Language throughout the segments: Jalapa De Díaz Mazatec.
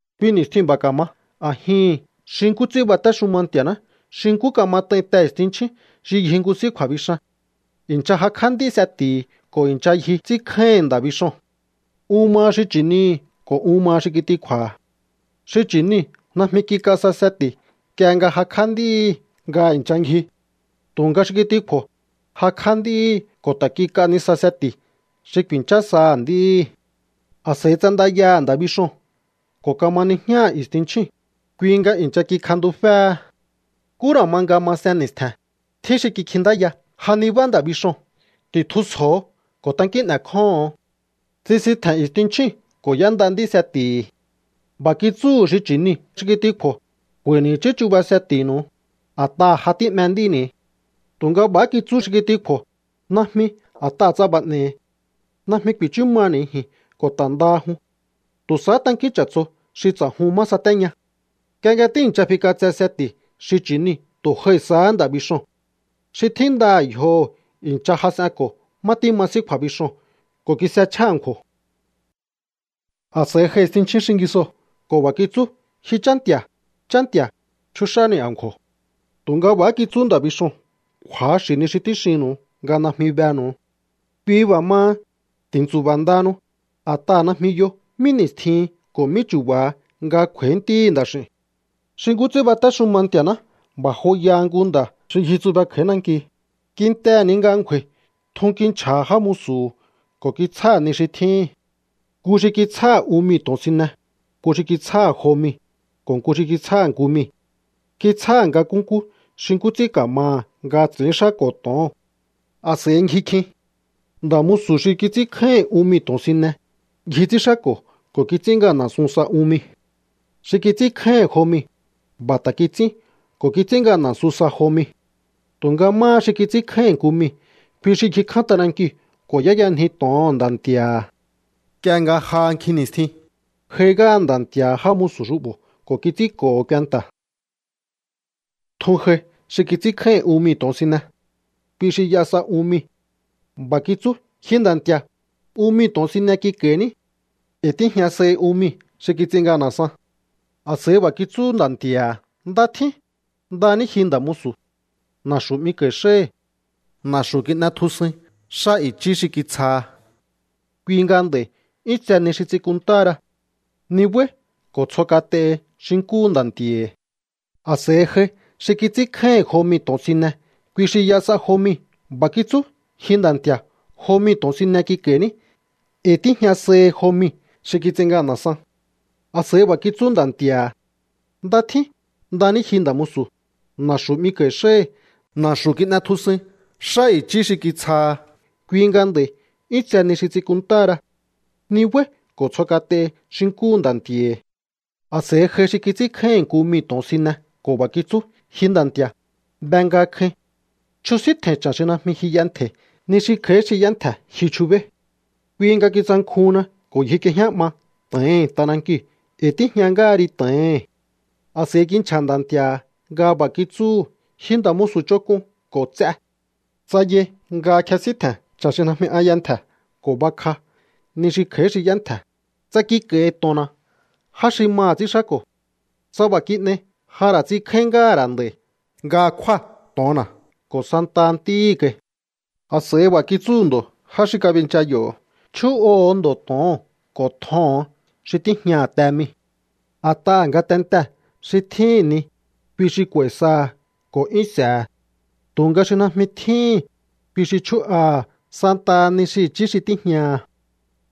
’Kui ni̱stjiu̱n b'a̱ ka̱ma a̱jihi̱n xi nkú ts'ín batéxuma Nti̱a̱ná xi nkú kamat'ain te i̱stinchjín xi ngji nku s'í kju̱a̱bixan. I̱ncha jakj'á nd'í seti̱hi̱ ko̱ i̱ncha ngji ts'ínkjáíhi̱n nda̱ bixoo̱n. Un maha xi chi̱nihi̱ ko̱ un maha xi kitikju̱a̱ha̱. Xi chi̱niu̱ najmi kik'a sa seti̱ nk'ie nga jakj'á nd'íhi̱ nga i̱ncha ngji. Tu̱nga xi kitikju̱o̱, jakj'á nd'íhi̱ ko̱ ta̱ kik'a nisa seti̱ xi ku̱i̱nchá saha̱ nd'íhi̱. ’A̱s'a̱i ts'andayaha̱ nda̱ bixoo̱n ko̱ kama nijñáha̱ i̱stinchjíu̱n, kui nga i̱ncha kikjantuféhe. Nkú ra̱ ma nga masen ni̱stje̱n, tjín xi kikjintáya: “¡Ja nibá nda̱ bixoo̱n! ¡Ti̱tjusjo̱o ko̱ tankín n'e̱kjóho̱on!” ’Tsisitje̱n i̱stinchjíu̱n ko̱ y'énda nd'í seti̱hi̱. B'a̱ kitsúhu̱ xi chi̱niu̱ xi kitikju̱o̱: “K'u̱a̱i̱ni̱ i̱chí chuba seti̱nu̱u, a̱t'aha̱ ja tí'me nd'íni̱.” Tu̱nga b'a̱há kitsú xi kitikju̱o̱: “Najmi, a̱t'aha̱ tsa b'a̱ n'e̱i̱, najmi ku̱i̱chú maha̱ni̱ ji̱n ko̱ ta̱ ndaha jun. Tu̱ sahá tankín ch'a̱tso xi ts'a̱jun má satéña.” Nk'ie nga tíi̱ncha fik'atse seti̱ xi chi̱niu̱, tu̱ j'ai sahá nda̱ bixoo̱n. Xi tjíndaha̱ yjoho̱ i̱ncha jas'enko̱ má tíma s'í kju̱a̱bixoo̱n ko̱ kis'echjá a̱nkju̱o̱. A̱s'a̱i j'ai i̱stinchjín xingisoo̱ ko̱ b'a̱ kitsú: “¡Ji chá nti̱a̱, chá nti̱a̱, chúx'áni̱ a̱nkju̱o̱!” Tu̱nga b'a̱há kitsú nda̱ bixoo̱n: “Kju̱axi̱ ni xi tíxinnu̱u nga najmi benu̱u.” ’Kui b'a̱ maha, ti̱ntsu̱ba̱ ndahanu, a̱t'aha̱ najmi yo mí ni̱stjin ko̱ mí chu̱ba̱ha nga kj'u̱a̱í Ntíhi̱ Nda̱x'i̱u̱n. ’Xi nkú ts'ín batéxuma Nti̱a̱ná b'a̱ joyaha nku nda̱ xi ngjitsube kj'a̱í nanki. Kintehe̱ ni nga ngju̱a̱i̱, tjun kinchja̱ha̱ já musu̱hu̱ ko̱ kitsjáha̱ ni xi tjíhi̱n. Nku xi kitsjáha̱ un mii̱ to̱onsine, nku xi kitsjáha̱ jo mii̱, ko̱ nku xi kitsjáha̱ nku mii̱. Kitsjáha̱ nga nkúnkú xi nkú ts'ín ka̱maha̱ nga ts'i̱ínxáko̱ to̱oo̱n. A̱s'a̱i ngji kjin. ’Nda̱ musu̱ xi kits'ínkjáíhi̱n un mii̱ to̱onsine, ngji ts'ínxáko̱ ko̱ kits'ín ngana̱sun sa un mii̱. Xi kits'ínkjáíhi̱n jo mii̱, b'a̱ ta̱ kits'ín ko̱ kits'ín ngana̱sun sa jo mii̱. Tu̱nga máha xi kits'ínkjáíhi̱n nku mii̱, kui xi ngji kján t'anankiu̱ ko̱ y'éyanji to̱oho̱n nda̱ nti̱a̱ha̱. ’Nk'ie nga j'a nkjin ni̱stjin, j'ai ngáha nda̱ nti̱a̱ha̱ já musu̱ xu'bo̱ ko̱ kits'ínko̱ho̱ kuenta̱. Tjun j'ai xi kits'ínkjáíhi̱n un mii̱ to̱onsine. Kui xi y'a sa un mii̱. B'a̱ kitsú: “Ji nda̱ nti̱a̱, un mii̱ to̱onsine kik'a̱i̱ní. E̱i̱ tíjña sahi un mii̱ xi kits'in ngana̱san.” A̱s'a̱i b'a̱ kitsú nda̱ nti̱a̱ha̱: “Nda tjín. Nda ní ji, nda̱ musu̱. Na̱xu̱ 'miko̱i̱ xáhi̱. Na̱xu̱ kin'etjusuin xá i̱chí xi kitsjaha. Kui nga nd'a̱i̱ 'yún tse ni xi ts'in kunntáhara. Nibái̱ ko̱ tsjo kat'ehi xi nkúhu nda̱ nti̱a̱hi̱.” ’A̱s'a̱i j'ai xi kits'ínkjáíhi̱n jo mii̱ to̱onsine. Kui xi y'a sa jo mii̱. B'a̱ kitsú: “Ji nda̱ nti̱a̱, jo mii̱ to̱onsine kik'a̱i̱ní. E̱i̱ tíjña sahi jo mii̱ xi kits'in ngana̱san.” A̱s'a̱i b'a̱ kitsú nda̱ nti̱a̱ha̱: “Nda tjín. Nda ní ji, nda̱ musu̱. Na̱xu̱ 'miko̱i̱ xáhi̱. Na̱xu̱ kin'etjusuin xá i̱chí xi kitsjaha. Kui nga nd'a̱i̱ 'yún tse ni xi ts'in kunntáhara. Nibái̱ ko̱ tsjo kat'ehi xi nkúhu nda̱ nti̱a̱hi̱.” ’A̱s'a̱i j'ai xi kits'ínkjáíhi̱n nku mii̱ to̱onsine ko̱ b'a̱ kitsú: “Ji nda̱ nti̱a̱, be nga kjain. Chjusíntje̱i̱n cha̱n xi najmi ji y'entje̱i̱. Ni xi kj'a̱í xi y'entje̱ ji chubéí. Kui nga kitsankjuhunna ko̱ ngjik'iejñá 'ma to̱ohi̱n t'anankiu̱. E̱i̱ tíjña ngáha ri to̱ohi̱n.” A̱s'a̱i kinchja̱ nda̱ nti̱a̱ha̱ nga b'a̱ kitsúhu̱: “Ji nda̱ musu̱ ch'onk'un ko̱ ts'e. Tsa yai nga kjesíntje̱n cha̱n xi najmi an y'entje̱ ko̱ bakj'á ni xi kj'a̱í xi y'entje̱, tsa kik'a̱i̱hi̱ to̱onna̱ já xi maha̱ ts'ínxáko̱. Tsa b'a̱ kin'ei, ja ra̱ ts'inkjáín ngáha̱ ra̱ nd'a̱i̱ nga kjúa̱ to̱onna̱ ko̱ santaha ntíhi̱ kai.” ’A̱s'a̱i b'a̱ kitsúhu̱ ndo̱ já xi kabincha yo̱: “Chjú'oho̱o ndo̱ to̱oo̱n ko̱ tjoho̱on xi tíjñaha̱ te mii̱. A̱t'aha̱ ngatentee̱ xi tjíhi̱n ni, kui xi k'u̱a̱i̱ saha̱ ko̱ 'yún s'e̱he̱. Tu̱nga xi najmi tjíhi̱n, kui xi chjú'aha̱ santaha ni xi i̱chí xi tíjñaha̱.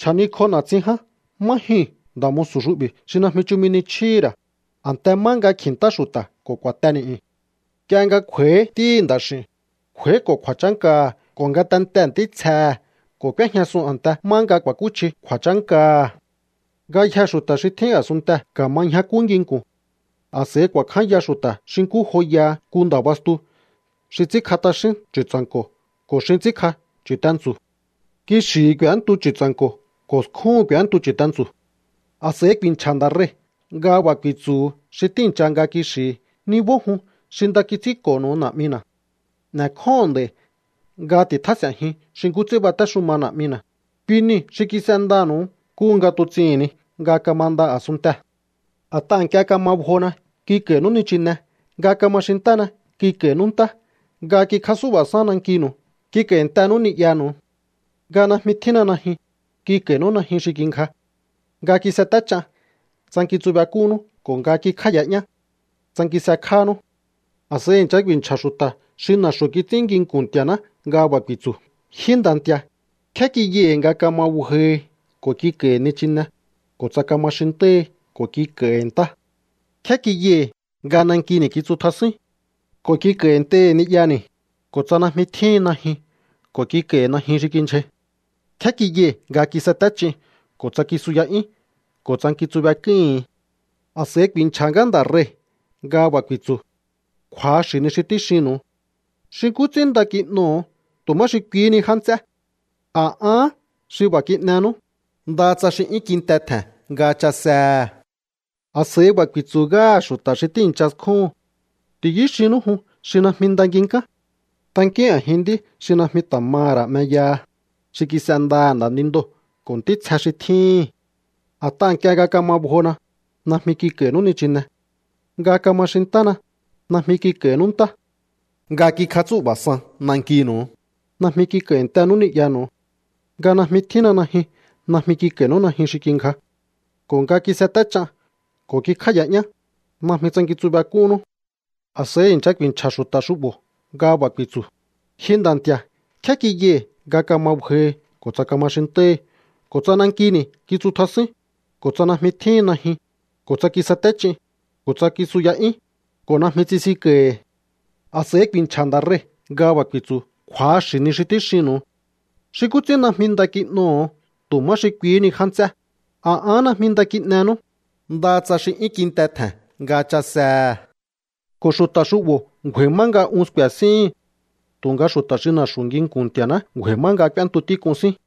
Chja̱nikj'o na̱tsin ján má jyuu̱n nda̱ musu̱ xu'bi̱ xi najmi chumi ni chjíhi̱ ra̱, a̱nte má nga kji̱ntá xu̱ta̱ ko̱ ku̱a̱te ni̱'yu̱n.” ’Nk'ie nga kj'u̱a̱i̱hí Ntíhi̱ Nda̱x'i̱u̱n, kj'u̱a̱íko̱ kju̱a̱chánkaha̱ ko̱ ngatentee̱ ntítsjehe̱ ko̱ k'úéjñasun a̱nte má nga ku̱a̱kúchji kju̱a̱chánkaha̱. Ngayjee̱ xu̱ta̱ xi tjín a̱sunntee̱ ka̱ma ñjakú nginku̱n. A̱s'a̱i ku̱a̱kjánya xu̱ta̱ xi nkú joyaha nku nda̱ bastu xi ts'ínkj'a t'axín chu̱tsa̱nko̱ ko̱ xin ts'ínkj'a chu̱tentsu̱. Kixi̱hi̱ k'u̱éntu chu̱tsa̱nko̱ ko̱ skjúhu̱n k'u̱éntu chu̱tentsu̱. ’A̱s'a̱i ku̱i̱nchja̱ Nda̱ Rei̱ nga b'a̱ ku̱i̱tsu̱hu̱ xi tíi̱ncha nga kixi̱hi̱: “Nibó jun xi nda kits'ínko̱nu̱u Na̱'mina̱. N'e̱kjóho̱on nd'a̱i̱ nga ti̱tjás'e̱njiun xi nkú ts'ín batéxuma Na̱'mina̱, kui niu̱ xi kis'endanu̱u nkúhu nga tuts'ihi̱n ni nga kamanda a̱sunntee̱. A̱t'aha̱ nk'ie nga kama bjona, kik'a̱i̱nú nichine. Nga kama xintána, kik'a̱i̱nú ntá. Nga kikjatsú'ba̱san nankinu̱u, kik'a̱i̱ntenú ni'yanu̱u. Nga najmi tjínna najyun, kik'a̱i̱nú najyun xi kingja. Nga kisaté ch'an, tsankintsubek'unnú. Ko̱ nga kikjáa̱ya'yán, tsankinsekjánú.” ’A̱s'a̱i i̱ncha ku̱i̱nchja̱ xu̱ta̱ xi na̱xu̱ kits'ín nginku̱n Nti̱a̱ná nga b'a̱ ku̱i̱tsu̱: “Ji Nda̱ Nti̱a̱, ¿nkjé kiyai̱ nga kama bjohi ko̱ kik'a̱i̱hi̱ nichine, ko̱ tsa kama xintáhi ko̱ kik'a̱i̱hi̱ ntá? ¿Nkjé kiyai̱ nga nankini̱ kitsutjasúín ko̱ kik'a̱i̱ntei̱hi̱ ni'yani̱, ko̱ tsa najmi tjíhin najyun ko̱ kik'a̱i̱hi̱ najyun xi kindyjai? ¿Nkjé kiyai̱ nga kisaté ch'in ko̱ tsa kisuya'yín ko̱ tsankintsubek'úíhi̱n?” A̱s'a̱i ku̱i̱nchja̱ ngáha Nda̱ Rei̱ nga b'a̱ ku̱i̱tsu̱: “Kju̱axi̱ ni xi tíxinnu̱u. Xi nkú ts'ín nda kin'oho̱o tu̱ má xi kuihí ni já nts'é, a̱ ahán xi b'a̱ kin'enú, ndaha tsa xi 'yún kinte tje̱n nga chasehe̱.” ’A̱s'a̱i b'a̱ ku̱i̱tsu̱ ngáha̱ xu̱ta̱ xi tíi̱ncha skjúhu̱n: “Ti̱yú xinnú jun xi najmi nda nginkán. Tankíún a̱jin nd'í xi najmi ta̱ maha̱ ra̱ 'meyaha, xi kis'endaha̱ nda̱nindoo̱ ko̱ ntítsje xi tjíhi̱n. A̱t'aha̱ nk'ie nga kama bjona, najmi kik'a̱i̱nú nichine. Nga kama xintána, najmi kik'a̱i̱nú ntá. Nga kikjatsú'ba̱san nankinu̱u, najmi kik'a̱i̱ntenú ni'yanu̱u. Nga najmi tjínna najyun, najmi kik'a̱i̱nú najyun xi kingja. Ko̱ nga kiseté ch'an ko̱ kikjáa̱ya'yán, najmi tsankintsubek'unnú.” ’A̱s'a̱i i̱ncha ku̱i̱nchja̱ xu̱ta̱ xu'bo̱ nga b'a̱ ku̱i̱tsu̱: “Ji Nda̱ Nti̱a̱, ¿nkjé kiyai̱ nga kama bjohi, ko̱ tsa kama xintáhi, ko̱ tsa nankini̱ kitsutjasúín, ko̱ tsa najmi tjíhin najyun, ko̱ tsa kisete ch'in, ko̱ tsa kisuya'yúín, ko̱ najmi tsisinko̱i̱hi̱?” A̱s'a̱i ku̱i̱nchja̱ ngáha Nda̱ Rei̱ nga b'a̱ ku̱i̱tsu̱: “Kju̱axi̱ ni xi tíxinnu̱u. Xi nkú ts'ín najmi nda kin'oho̱o tu̱ má xi kuihí ni já nts'é, a̱ ahán najmi nda kin'enú, ndaha tsa xi 'yún kinte tje̱n nga chasehe̱.” ’Ko̱ xu̱ta̱ xu'bo̱ ngju̱a̱i̱ má nga un sku̱e̱ síhi̱n. Tu̱nga xu̱ta̱ xi na̱xu̱ nginku̱n Nti̱a̱ná ngju̱a̱i̱ má nga k'úéntu tík'un sín.